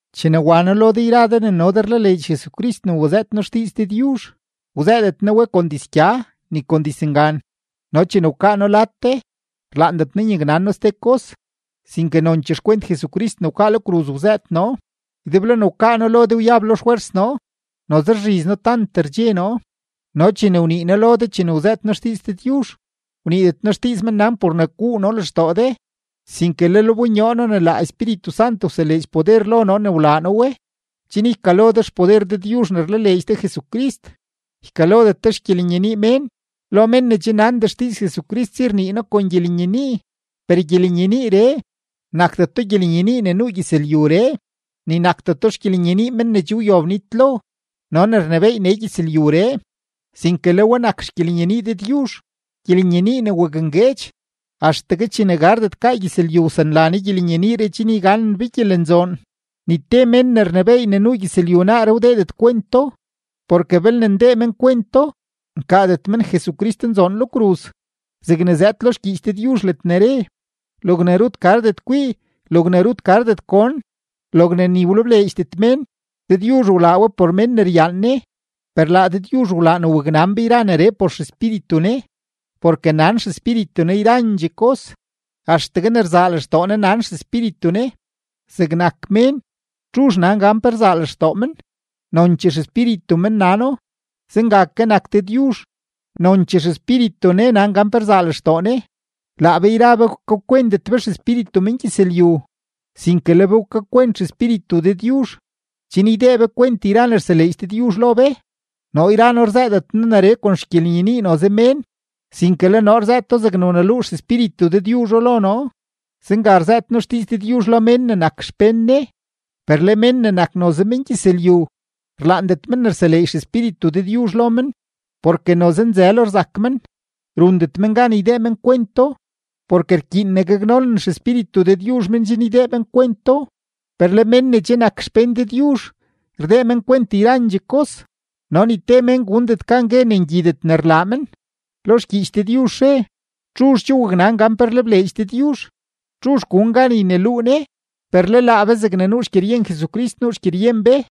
Chene wa noo lo de yra de ne no de rlaleedx Jesucrist ne wazëët noo xdiiz Dëdyuzh, wzëëdet noo we kon dizgya ni kon dizngan. No chene wkaa noo lad de, rlaandet noo nyaknan noo ste kos, sinke nonchee xkwent Jesucrist ne wkaa lo kruz wzëët noo. Ydeblo ne wkaa noo lo de, wyab lo xfwers noo, noze rzhiz noo tant rdxe noo, no chene wnii noo lo de chene wzëët noo xdiiz Dëdyuzh, wniidet noo xdiiz mennan por ne guu noo lextoo de, sinke lel wbonyoo noo ne laa Espíritu Sant wseleedx poder lo noo ne wlaa noo we, chen ykalo de xpoder Dëdyuzh ne rlaleedx de Jesucrist, ykalodet de xgyelenyenii mén. Lo mén ne che nandee xdiiz Jesucrist si rnii noo kon gyelenyenii, per gyelenyeniiree, nakdeto gyelenyenii ne nuu gyëzlyuree, ni nakdeto xgyelenyenii men ne che wyob nitlo no ne rnebééy nee gyëzlyuree, sinke le we nak xgyelenyenii Dëdyuzh, gyelenyenii ne wakngueedx. Axtegue chene gardet gaa gyëzlyu wsanla Ne gyelenyeniiree chen yganen be gyelenzoon. Ni te mén ne rnebééy ne nuu gyëzlyu naaree wdeedet kwento; porke belne ndee men kwento, nkaadet men Jesucristnzoon lo kruz. Zegne zëëd lo xgyiich Dëdyuzh ledne re: Logne rut gardet kwii, logne rut gardet gon, logne ni wlebleedxdet mén, Dëdyuzh wlaa we por mén ne ryaan Ne. Per laa Dëdyuzh wlaa ne waknan be yra neree por XEspíritu Ne, porke nan XEspíritu Ne yrandxee kos, axtegue ne rzaa lextoo Ne nan XEspíritu Ne. Zegnak mén, ¿txuzh nan gan pe rzaa lextoo men? Nonchee xespíritu men nano. Zenga ke nak Dëdyuzh, nonchee XEspíritu Ne nan gan pe rzaa lextoo Ne. Laa be yra be wkakwentet be xespíritu mengyëzlyu, sinke le be wkakwent XEspíritu Dëdyuzh, chen ydee be kwent yra ne rseleedx Dëdyuzh lo be. Noo yra noo rzëëdet noo neree kon xgyelenyenii noze mén, sinke le noo rzëëto zegne wneluu XEspíritu Dëdyuzho lo noo. Zenga rzëët noo xdiiz Dëdyuzh lo mén ne nak xpén Ne. Per le mén ne nak noze mengyëzlyu, rlaandet men ne rseleedx XEspíritu Dëdyuzh lo men, porke noze nzëlo rzak men; rundet men gan ydee men kwento, porke rkyiin ne gaknonen XEspíritu Dëdyuzh men chen ydee men kwento. Per le mén ne che nak xpén Dëdyuzh, rdee men kwent yrandxee kos, no ni te mén gundet gan gue ne ngyidet ne rlaa men. Lo xgyiich Dëdyuzh re: “¿Txuzh che waknan gan pe rlebleedx Dëdyuzh? ¿Txuzh gun gan yneluu Ne?” Per le laa be zegne nuu xgyeryen Jesucrist nuu xgyeryen be.